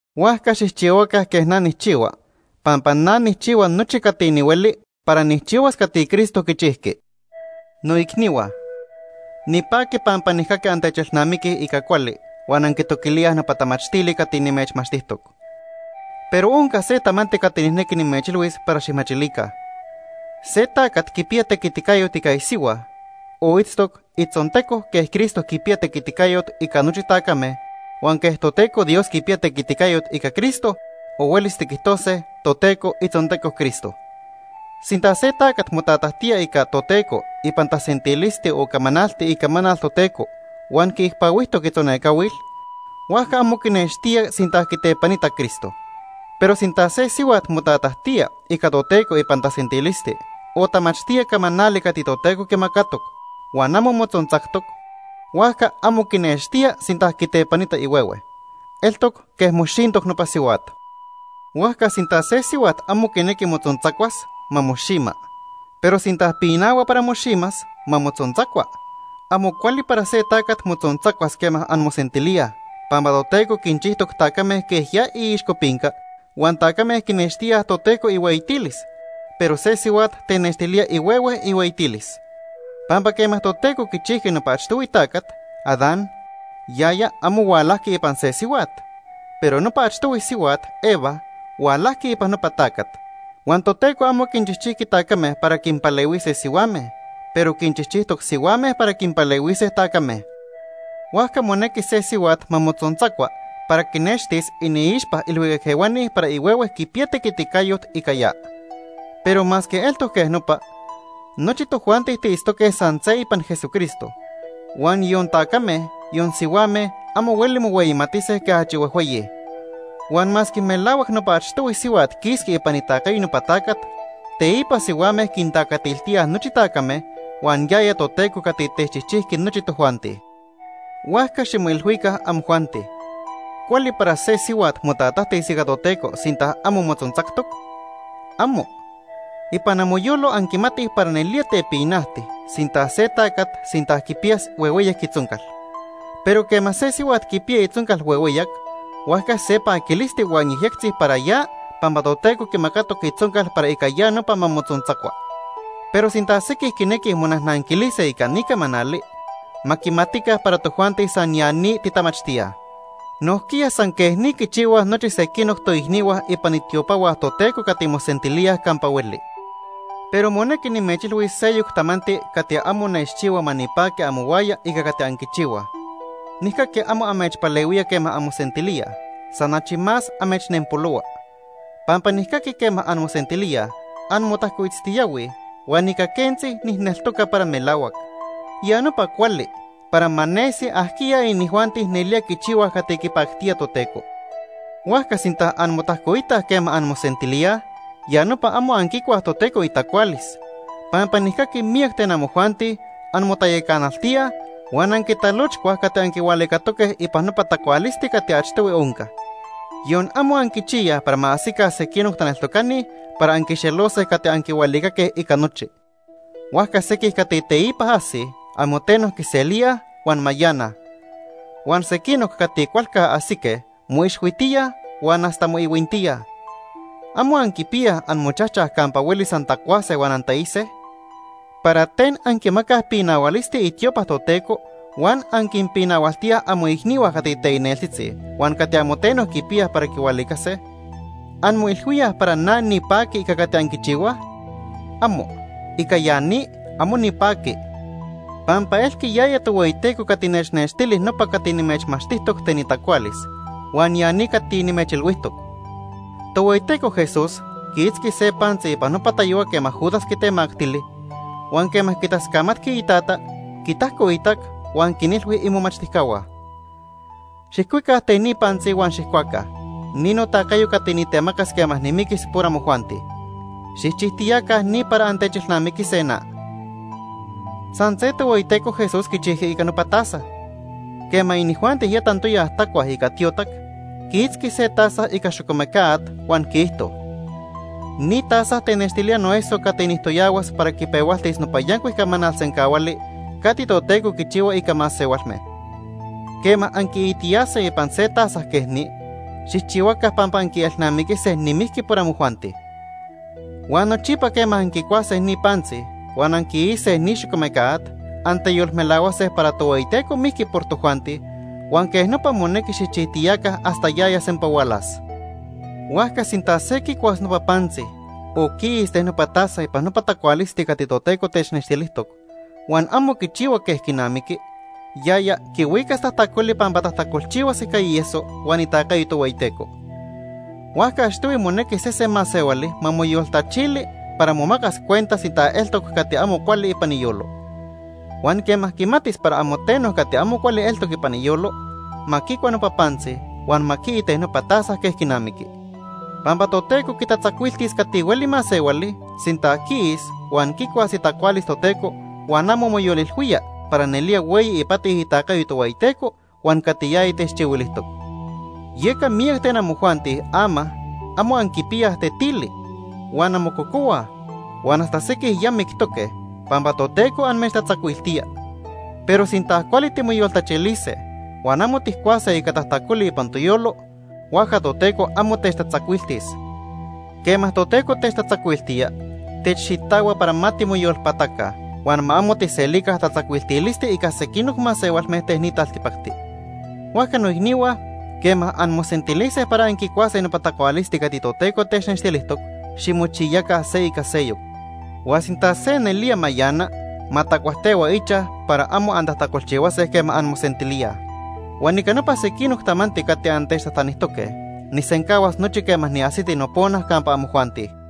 Huajca xijchihuaca quej na nijchihua pampa na nijchihua nochi cati nihueli para nijchihuas cati Cristo quichijqui. Noicnihua, nipaqui pampa nijcaqui antechelnamiquij ica cuali huan anquitoquilíaj nopa tamachtili cati nimechmachtijtoc. Pero onca se tamanti cati nijnequi nimechilhuis para xijmachilica. Se tacat quipiya tequiticayot ica isihua o itztoc itzonteco quej Cristo quipiya tequiticayot ica nochi tacame, huan quej Toteco Dios quipiya tequiticayot ica Cristo o huelis tiquijtose Toteco itzonteco Cristo. Sinta se tacat motatajtía ica Toteco ipan tasentilisti o camanalti icamanal Toteco huan quiicpahuijtoc itzonecahuil, huajca amo quinextía sinta quitepanita Cristo. Pero sinta se sihuat motatajtía ica Toteco ipan tasentilisti o tamachtía camanali cati Toteco quimacatoc huan amo motzontzactoc, huajca amo quinextía sinta quitepanita ihuehue. Eltoc quej moxintoc nopa sihuat. Huajca sinta se sihuat amo quinequi motzontzacuas, ma moxima. Pero sinta pinahua para moximas, ma motzontzacua. Amo cuali para se tacat motzontzacuas quema anmosentilíaj, pampa Toteco quinchijtoc tacame quej ya iixcopinca huan tacame quinextíaj Toteco ihueyitilis, pero se sihuat tenextilía ihuehue ihueyitilis. Pampa quema Toteco quichijqui nopa achtohui tacat, Adán, yaya amo hualajqui ipan se sihuat, pero nopa achtohui sihuat, Eva, hualajqui ipan nopa tacat. Huan Toteco amo quinchijchijqui tacame para quinpalehuise sihuame, pero quinchijchijtoc sihuame para quinpalehuise tacame. Huajca monequi se sihuat ma motzontzacua para quinextis iniixpa ilhuicac ehuani para ihuehue quipiya tequiticayot ica ya. Pero masque eltoc quej nopa, nochi tojuanti tiitztoque san se ipan Jesucristo, huan yon tacame, yon sihuame amo hueli mohueyimatise quej achi huejhueyi. Huan masque melahuac nopa achtohui sihuat quisqui ipan itacayo nopa tacat, teipa sihuame quintacatiltíaj nochi tacame, huan yaya Toteco cati techchijchijqui nochi tojuanti. Huajca ximoilhuica, amojuanti. ¿Cuali para se sihuat motatajtis ica Toteco, sinta amo motzontzactoc? ¡Amo! Ipan amoyolo anquimatij para nelía tepinajti sinta se tacat sinta quipiyas huehueyac itzoncal, pero quema se sihuat quipiya itzoncal huehueyac, huajca se paquilisti huan yejyectzi para ya pampa Toteco quimacatoc itzoncal para ica ya nopa ma motzontzacua. Pero sinta sequij quinequij monajnanquilise ica ni camanali, ma quimatica para tojuanti san ya ni titamachtíaj. Nojquiya san quej ni quichihuaj nochi sequinoc toicnihua ipan itiopahua Toteco cati mosentilíaj campa hueli. Pero monequi nimechilhuis seyoc tamanti cati amo nechchihua ma nipaqui amohuaya ica cati anquichihuaj. Nijcaqui amo amechpalehuía quema anmosentilíaj, san achi más amechnenpolohua. Pampa nijcaqui quema anmosentilíaj, anmotajcoitztiyahuij, huan ica quentzi nijneltoca para melahuac. Ya nopa cuali, para ma nesi ajquiya inijuanti nelía quichihuaj cati quipactía Toteco. Huajca sinta anmotajcoitaj quema anmosentilíaj, ya nopa amo anquicuaj Toteco itacualis, pampa nijcaqui miyac ten amojuanti anmotayacanaltíaj huan anquitalochcuaj cati anquihualicatoque ipan nopa tacualisti cati achtohui onca. Yon amo anquichiyaj para ma ajsica sequinoc taneltocani para anquixelose cati anquihualicaque ica nochi. Huajca sequij cati teipa ajsij amo teno quiselíaj huan mayanaj. Huan sequinoc cati cualca ajsique moixhuitíaj huan hasta moihuintíaj. ¿Amo anquipiyaj amochajchaj campa huelis antacuase huan antaise? ¿Para ten anquimacaj pinahualisti itiopa Toteco huan anquinpinahualtíaj amoicnihua cati teicneltzitzi huan cati amo teno quipiyaj para quihualicase? ¿Anmoilhuíaj para na nipaqui ica cati anquichihuaj? ¡Amo! ¡Ica ya ni, amo nipaqui! Pampa elqui yaya Tohueyiteco cati nechnextili nopa cati nimechmachtijtoc ten itacualis, huan ya ni cati nimechilhuijtoc. Tohueyiteco Jesús quiitzqui se pantzi ipan nopa tayohua quema Judas quitemactili, huan quema quitascamatqui iTata, quitajcoitac, huan quinilhui imomachtijcahua: “Xijcuica ten ni pantzi huan xijcuaca. Ni notacayo cati nitemacas quema nimiquis por amojuanti. Xijchijtiyaca ni para antechelnamiquise na.” San se Tohueyiteco Jesús quichijqui ica nopa taza. Quema inijuanti ya tantoya tacuaj ica tiotac, quiitzqui se taza ica xocomeca at huan quiijto: “Ni taza tenextilía noeso cati nijtoyahuas para quipehualtis nopa yancuic camanal sencahuali cati Toteco quichihua ica masehualme. Quema anquiitiyase ipan se taza quej ni, xijchihuaca pampa anquielnamiquise nimijqui por amojuanti.” Huan nochipa quema anquicuase ni pantzi huan anquiise ni xocomeca at, anteyolmelahuase para Tohueyiteco mijqui por tojuanti huan quej nopa monequi xijchijtiyaca hasta yaya sempa hualas. Huajca sinta se quicuas nopa pantzi o quiis ten nopa taza ipan nopa tacualisti cati Toteco technextilijtoc, huan amo quichihua quej quinamiqui, yaya quihuicas tajtacoli pampa tajtacolchihuas ica ieso huan itacayo Tohueyiteco. Huajca achtohui monequi sese masehuali ma moyoltachili para momacas cuenta sinta eltoc cati amo cuali ipan iyolo. Huan quema quimatis para amo teno cati amo cuali eltoc ipan iyolo, ma quicua nopa pantzi huan ma quii ten nopa taza quej quinamiqui. Pampa Toteco quitatzacuiltis cati hueli masehuali sinta quiis huan quicuas itacualis Toteco huan amo moyolilhuía para nelía hueyi ipati itacayo Tohueyiteco huan cati yaya techchihuilijtoc. Yeca miyac ten amojuanti ama amo anquipiyaj tetili, huan anmococohuaj, huan hasta sequij ya mictoque pampa Toteco amechtatzacuiltía. Pero sinta cuali timoyoltachilise huan amo tijcuase ica tajtacoli ipan toyolo, huajca Toteco amo techtatzacuiltis. Quema Toteco techtatzacuiltía, techxitahua para ma timoyolpataca huan ma amo tijselica tatzacuiltilisti ica sequinoc masehualme ten ni taltipacti. Huajca noicnihua, quema anmosentilise para anquicuase nopa tacualisti cati Toteco technextilijtoc, ximochiyaca se ica seyoc. Huan sinta se nelía mayana, ma tacuajtehua ichaj para amo antajtacolchihuase quema anmosentilíaj. Huan ica nopa sequinoc tamanti cati antechtajtanijtoque, nijsencahuas nochi quema niajsiti nopona campa amojuanti.